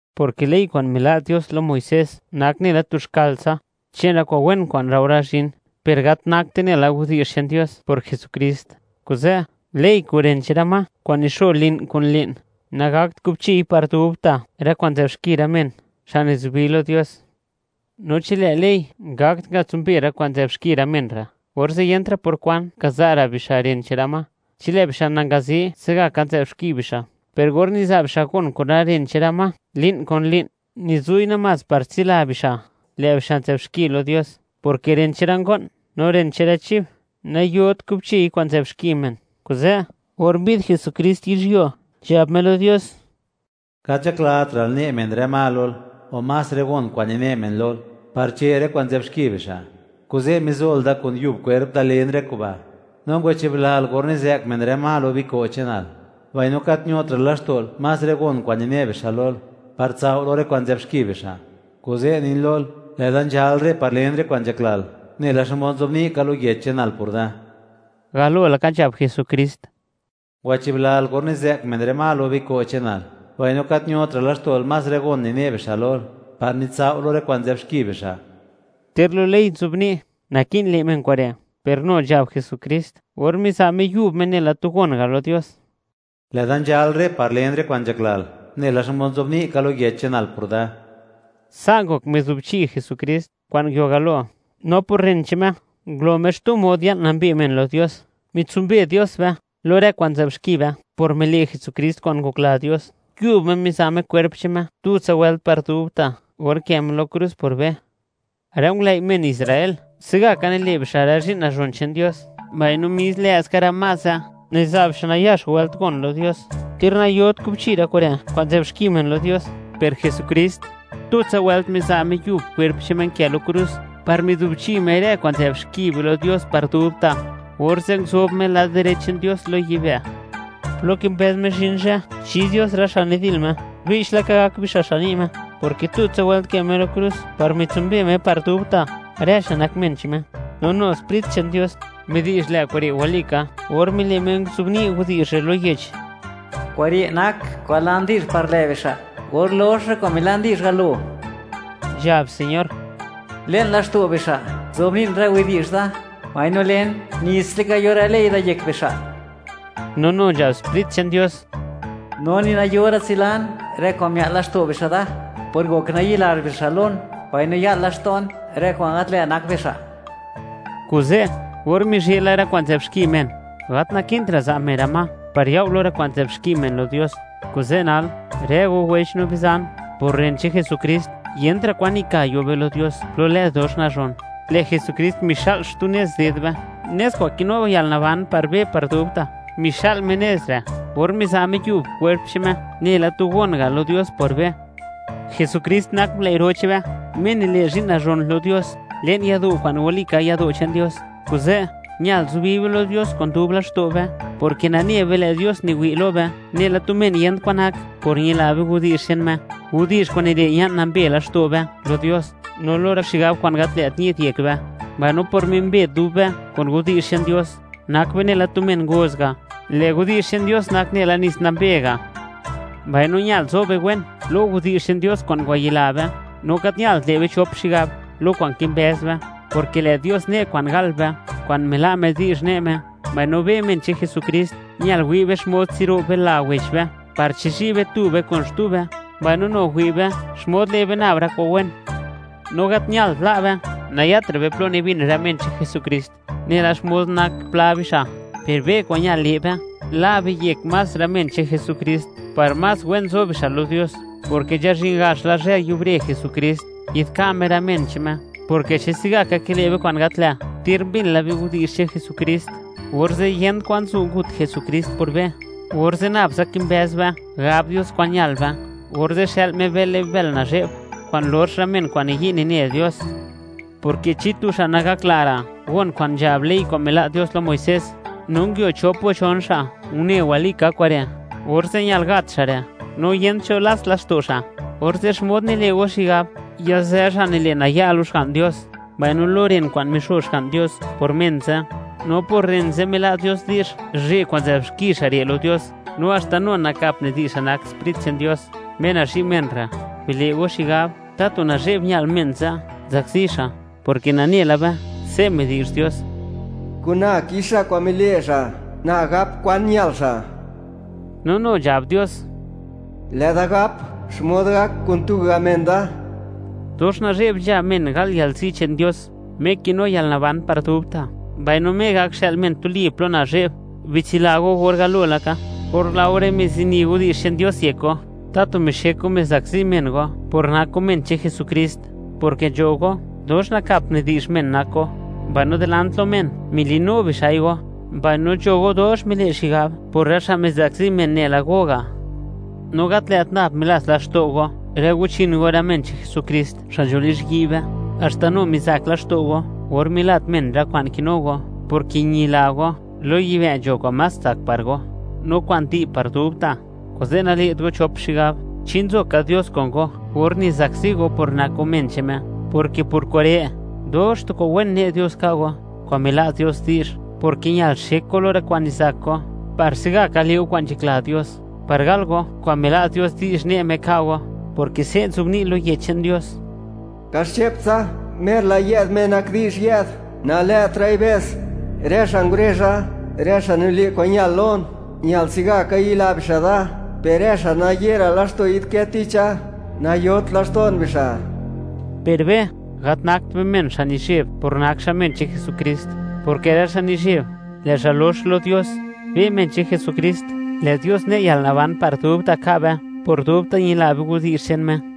Porke ley kwa'n mila' Dios lo Muisés nak nela tu xkal tsa che'n rë kwa'n wen kwa'n laore zhin, per gat nakte nela widi'zh che'n Dios por Jesukrist; kuze', ley kun ren che'n rë ma kwa'n nixo li'n kun li'n, nagakt kubchiy par dubta' rë kwa'n nzë'bxki rë men, xa' nizubi lo Dios. No chi lë' ley ngak ngatsimbe rë kwa'n nzë'bxki rë men re', orze' yentra' por kwan ngaza'ra' bixa' ren che'n rë ma, chi lë' bixa' nangazi se'gaka nzë'bxki bixa'. Per or niza' bixa' gon kun ren che'n rë ma li'n kun li'n, nizu'i namás par nitsila bixa', lë' bixa' nzë'b xki lo Dios, porke ren che'n rë ngo'n, no ren che'n rë chib, nayot kubchiy kwa'n nzë'b xki men. Kuze', or mbi'd Jesukrist yizhyuo, nzhab Me lo Dios: Gat nzhaklatra'l ne' men rë ma lol, o más rë gon kwa'n nine' men lol, par che' rë kwa'n nzë'b xki bixa'. Kuze' mizol Da, kun yub kwerp Da len rë kuba'. No ngwachi'blal or nizë'k men rë ma lo biko' che'nal, mbaino gat ñotra' laxto'l más rë gon kwa'n nine' bixa' lol, par tsao' lo rë kwa'n nzë'b xki bixa'. Kuze' nin lol: “Lë' Da nzhal re' par len rë kwa'n nzhaklal, nela xmod nzobni' ka lo Yech che'nal por Da.” Galo laka nzhab Jesukrist: “Ngwachi'blal or nizë'k men rë ma lo biko' che'nal, mbaino gat ñotra' laxto'l más rë gon nine' bixa' lol, par nitsao' lo rë kwa'n nzë'b xki bixa'”, ter lo ley nzobni', naki'n le' men rë kure'. Per nu nzhab Jesukrist or miza' Me yub Me nela tu gon ga' lo Dios: “Lë' Da nzhal re' par len rë kwa'n nzhaklal, nela xmod nzobni' ka lo Yech che'nal por Da.” Sa' ngok mizubchi Jesukrist kwa'n nguio galo, no por ren che'n Me, ngulo Me xtu mod ya'n nambe men lo Dios. Mitsimbe Dios be lo rë kwa'n nzë'b xki be por mile' Jesukrist kwa'n ngokla Dios; yub Me miza' Me kwerp che'n Me tutsa wëlt par dubta', or nkë Me lo krus por be. Rë ngulëi' men Israel, se'gaka nile' bixa' rë zhi'n nazhon che'n Dios, mbaino mis lë'ska rë ma ze' niza' bixa' nayax wëlt gon lo Dios, ter nayot kubchi rë kure' kwa'n nzë'b xki men lo Dios. Per Jesukrist, tutsa wëlt miza' Me yub kwerp che'n Me nkë lo krus par mizubchi Me rë kwa'n nzë'b xki be lo Dios par dubta', orze' nguzob Me lad direch che'n Dios lo yibë', plo kimbëz Me zhin zhë, chi Dios rë xa' nidil Me, che'ptsa (bi'ch laka) gak bixa' xan ni' Me, porke tutsa wëlt nkë Me lo krus par mitsimbe Me par dubta', rë xa' nak men che'n Me. No nu Sprit che'n Dios, midi'zh lë' kure' walika or mile' Me nguzobni' widi'zh re' lo Yech: Kure' nak kwa'n lan di'zh par lë' bixa', or lox rë kwa'n milan di'zh galo, nzhab Señor. Le'n laxto' bixa' zobni'n rë widi'zh Da, mbaino len, nits laka yo rë ley Da yek bixa'. No nu nzhab Sprit che'n Dios: No ni nayora' tsilan rë kwa'n mia'l laxto' bixa' Da, por ngok nayi'lazh bixa' Lon, mbaino ya'l laxto'n rë kwa'n gat lë' nak bixa'. Kuze', or mizhe' la rë kwa'n nzë'b xki men, gat naki'ntra' za' men rë ma par yao' lo rë kwa'n nzë'bxki men lo Dios. Kuze' nal, rë go wech no bizan, por ren che'n Jesukrist, yentra' kwan nika yo be lo Dios plo lë dox nazhon. Lë' Jesukrist mixa'l xtu nez ded be, nez kwa'n kinu yalnaban par be par dubta'. Mixa'l Me nez re' or miza' Me yub kwerp che'n Me nela tu gon ga' lo Dios por be. Jesukrist nak ngulëi' ro che'n be, Me nile' zhi'n nazhon lo Dios le'n yado' kwa'n walika yado' che'n Dios. Kuze', ñal zubi be lo Dios kun dub laxto' be, porke nane be lë' Dios niwi' lo be nela tu men yent kwan nak por ñila be widi'zh che'n Me, widi'zh kwa'n nile' ña'n nambe laxto' be lo Dios no lo rë xigab kwa'n gat lë't ñi'd yek be; mbaino por mimbe dub be kun widi'zh che'n Dios, nak be nela tu men ngoz ga', lë' widi'zh che'n Dios nak nela nits nambe ga'. Mbaino, ñal zo be wen lo widi'zh che'n Dios kwa'n ngwayila be, no gat ñalt le' be chop xigab lo kwa'n kimbëz be, porke lë' Dios ne' kwa'n gal be, kwa'n mila' Me di'zh ne' Me; mbaino be men che'n Jesukrist, ñal wi' be xmod tsiro'b be la wech be par chizhi' be tu be kun xtu be; mbaino nu wi' be xmod le' be nab rë kwa'n wen. No gat ñalt la' be nayatra' be plo nibin rë men che'n Jesukrist, nela xmod nak pla bixa'; per be kwa'n ñal le' be, la be yek más rë men che'n Jesukrist par más wen zo bixa' lo Dios, porke nzhazhin gax la zhë yubre Jesukrist, yi'd ka' Me rë men che'n Me. Porke chi se'gaka kile' be kwa'n gat lë' ter mbin la be widi'zh che'n Jesukrist, orze' yent kwan zu' ngut Jesukrist por be. Orze' nab tsa kimbëz be gab Dios kwan ñal be, orze' xë'l Me be le'n bël nazhe'b kwa'n lo'x rë men kwa'n niyi' nine Dios. Porke chi tu xa' nagakla ra', gon kwa'n nzhab ley kwa'n mila' Dios lo Muisés, no nguio chop o chon xa' une walika kure', orze' ñal gat xa' re', no yent cho lats laxto' xa'. Orze', ¿xmod nile' go xigab, yazë xa' nile' naya' lo Xga'n Dios, mbaino lo ren kwa'n mixo Xga'n Dios por men ze'? No por ren ze' mila' Dios di'zh, zhe' kwa'n nzë'b xki xa' re' lo Dios. No haxta nu nakap nidi'zh xa' nak Sprit che'n Dios, Me nazhi' men re'. ¡Bile' go xigab, tatu nazhe'b ñal men ze', zakzi xa'! Porke nane la be, se' midi'zh Dios: “Kun Na kix xa' kwa'n mile' xa', Na gap kwan ñal xa'.” No nu nzhab Dios: “Lë' Da gap xmod gak kun tu ga' men Da.” ¡Dox nazhe'b nzha men gal yalzi che'n Dios, Me kinu yalnaban par dubta' mbaino Me gak xë'l men tuli plo nazhe'b! Bitsila go or galo laka, or laore mizini widi'zh che'n Dios yek go, tatu mixek go mizakzi men go por nak go men che'n Jesukrist, porke nzho go, dox nakap midi'zh men nak go, mbaino dilant lo men milinu bixa'i go; mbaino nzho go dox mile' xigab por rë xa' mizakzi men nela go ga'. No gat lë't nab milats laxto' go rë guchin go rë men che'n Jesukrist, xa' nzho lizhyi'be; haxta nu mizak laxto' go or milat men rë kwa'n kinu go, porke ñila go, lo yibë' nzho kwa'n más tsak par go, no kwa'n di' par dubta'. Kuze' nale't go chop xigab chi nzo ka Dios kun go or nizakzi go por nak go men che'n Me, porke por kure', dox tu kwa'n wen ne' Dios ka' go, kwa'n mila' Dios di'zh. Porke ñal xek go lo rë kwa'n nizak go, par se'gaka le' go kwa'n nzhakla Dios, par gal go kwa'n mila' Dios di'zh ne' Me ka' go, porke se' nzobni' lo Yech che'n Dios: Kaxche'ptsa, mer la yë'd Me nak di'zh yë'd, nalë'tra'i be's. Rë xa' ngurezha, rë xa' nile' kwa'n ñal lon, ñal se'gaka yila bixa' Da. Per rë xa' nayera' laxto' yi'dkë ticha, nayot laxto'n bixa'. Per be, gat nakt be men xa' nizheb por nak xa' men che'n Jesukrist, porke rë xa' nizheb, lë' xa' lox lo Dios; be men che'n Jesukrist, lë' Dios ne' yalnaban par dubta' ka' be, por dubta' ñila be widi'zh che'n Me.